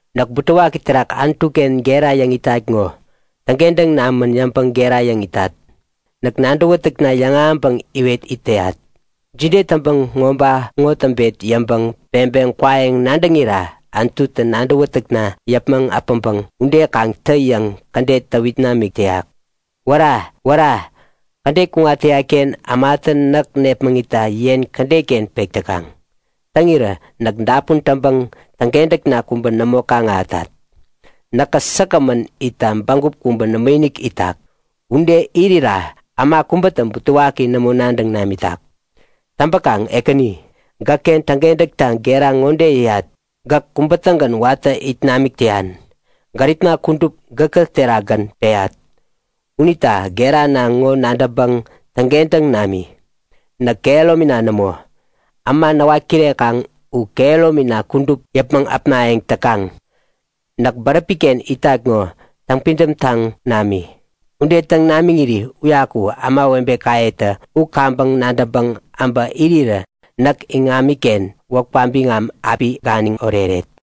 Näk butewaki terak Anutuken gera yäŋ itat ŋo. Täŋkentäŋ namän yäŋpäŋ gera yäŋ itat. Näk nadäwätäkna yäŋahäŋpäŋ iwet it täyat. Jide täŋpäŋ ŋoba ŋo täŋpet yäŋpäŋ peŋpeŋ kwayäŋ nadäŋira Anututä nadäwätäkna yäpmäŋ äpäŋpäŋ ude kaŋ tä yäŋ kädet täwit namik täyak. Wära, wära! Kädet kuŋat täyatken ämatä näk nepmäŋitta yen kädetken pek täkaŋ. Täŋirä näk dapun täŋpäŋ täŋkentäkna kubä nämo kaŋ-ahätat. Näkä säkgämän itta bägup kubä nämoinik itak. Ude irira äma kubätä butewaki nämo nadäŋ namitak. Täŋpäkaŋ Ekäni, gäkken täŋkentäkta gera ŋode yäyat; Gäk kubä-tägän watä it namik täyan. Gäripna kudup gäkä terakgän peyat. Unita gerana ŋo nadäŋpäŋ täŋkentäŋ nami. Näk kehäromina nämo. Äma näwat kirekaŋ u kehäromina kudup yäpmäŋ äpnayäŋ täkaŋ. Näk bäräpiken itat ŋo täŋpidäm taŋ nami. Ude täŋ namiŋiri uyaku ämawebekayetä u kaŋpäŋ nadäŋpäŋ äbä irirä näk iŋamiken wäpka biŋam api ganiŋ oreret.